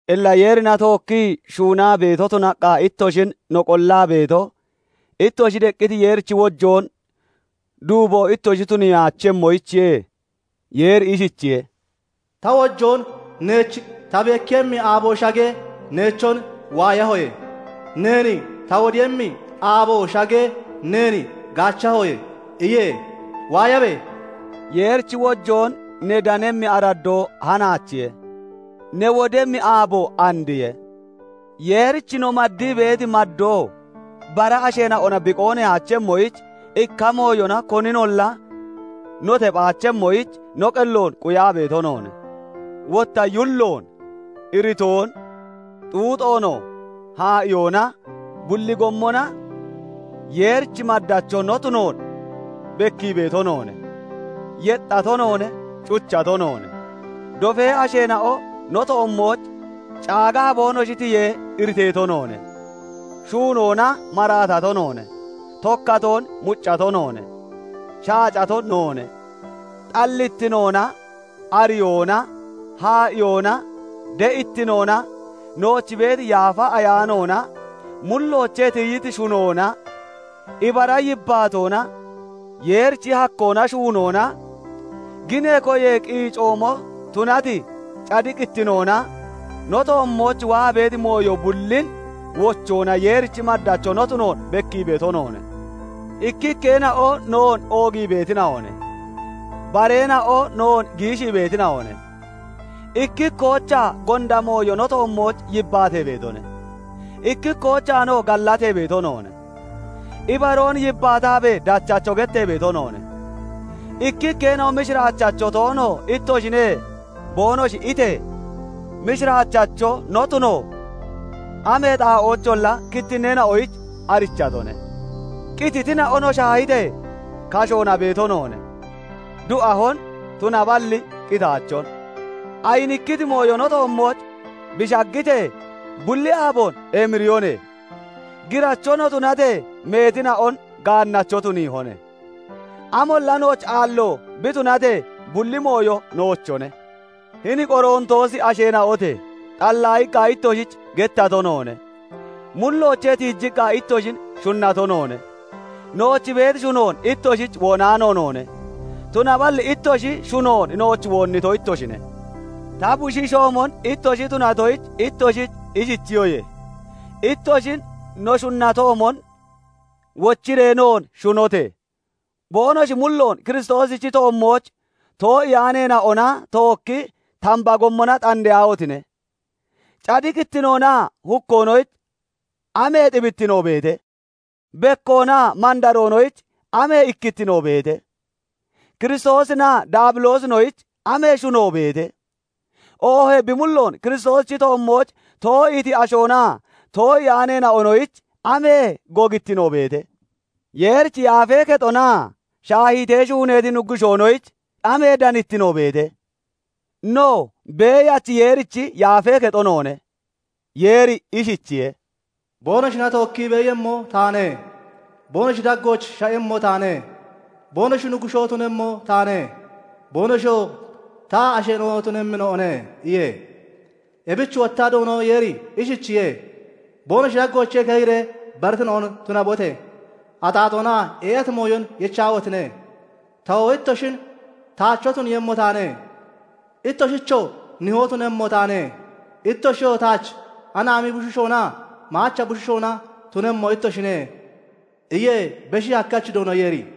Illa Yeerina tookkii shuunaa beeto tunaqqa ittoshin no qollaa beeto, ittoshi deqqiti Yeerichi wojoon duuboon ittoshi tuniyaachemmoyichiye. Yeeri ishichiye:- Ta wojoon neech ta bekkiiyemmi aabo shagee, neechon waayahoye; neen ta wodiiyemmi aabo shagee, neen gaachahoye iye. Waayabe! Yeerichi wojoon ne danemmi araddoo hanaachiye; ne wodemmi aaboo andiye. Yeerich no maddii beeti maddoo bara asheena'ona bi qoonneyaachemmoyich, ikka mooyona koninolla no tephaachemmoyich no qelloon quyaa beeto noone; wotta yulloon, iritoon, xuuxoonoo haa'iyoona bulli gommona Yeerichi maddacho no tunoon bekkii beeto noone; yexxato noone; cuchato noone; dofee asheena'o no toommooch caagaa boonoshi tiyee iriteeto noone; shuunoona maraatato noone; tokkatoon muccato noone; shaacato noone. Xallittinoona, ariyoona, haa'iyoona, de'ittinoona, nooch beeti Yaafa Ayaanoona, mulloochee tiyiti shunoona, ibara yibbaatoona, Yeerichi hakkoona shuunoona, ginee koyee qiicoomo tunati cadiqittinoona, no toommooch waa beeti mooyo bullin wochoona Yeerichi maddacho no tunoon bekkii beeto noone; ikkikkeena'o noon oogii beetina'one; bareena'o noon giishii beetina'one; ikkikkoochaa gonda mooyo no toommooch yibbaatee beetoone; ikkikkoochaanoo gallatee beeto noone. Ibaroon yibbaataabee dachacho gettee beeto noone; ikkikkeena'o "Mishiraachacho toono ittoshine" boonoshi itee, mishiraachacho no tuno amee xaa'oocholla kittinneena'oyich arichatone; qititina'o no shaahitee kashoona beeto noone; du'ahone; tunaballi qitaachone. Ayinikkiti mooyo no toommooch bi shaggitee, bulli aaboon emiriyone; giracho no tunatee, meetina'on gaannacho tuniihone; amolla nooch aallo bi tunatee, bulli mooyo noochone. Hini Qorontoosi asheena'ote! Xallaayiqqa ittoshich gettato noone; mulloochee tiijiqqa ittoshin shunnato noone. Nooch beeti shunoon ittoshich woonaano noone; tunaballi ittoshi shunon nooch woonnito ittoshine; ta bushiishoomon ittoshi tunatoyich ittoshich ishichiyoye; ittoshin no shunnatoomon wochiree noon shunote! Boonoshi mulloon Kiristoosichi toommooch too'iyaaneena'ona tookki tamba gommona xandeyaahotine! Cadiqittinoonaa hukkoonoyich amee xibittino beete? Bekkoonaa mandaroonoyich amee ikkittino beete? Kiristoosinaa Daabiloosinoyich amee shuno beete? Oohee bi mulloon Kiristoosichi toommooch too'iiti ashoonaa too'iyaanoonoyich amee gogittino beete? Yeerichi yaafee kexonaa shaahiitee shuuneeti nuggushoonoyich amee danittino beete? No, Beeyachi Yeerichi yaafee kexo noone; Yeeri ishichiye:- Boonoshina tookki beeyemmo taane; boonoshi daggooch sha'emmo taane; boonoshi Nuggushoo tunemmo taane; boonoshiyoo ta asheena'o tunemmina'one iye. Ebich wotta Doono Yeeri ishichiye:- Boonoshi daggoochee keyiree baritina'on tunabote! Axaaxoona ee'ati mooyon yechaahotine! tawoo ittoshin taacho tuniiyemmo taane; ittoshichoo Nihoo tunemmo taane; ittoshiyoo taach anaami bushiishoonaa maacha bushiishoona tunemmo ittoshine iye Beshi Hakkachi Doono Yeeri.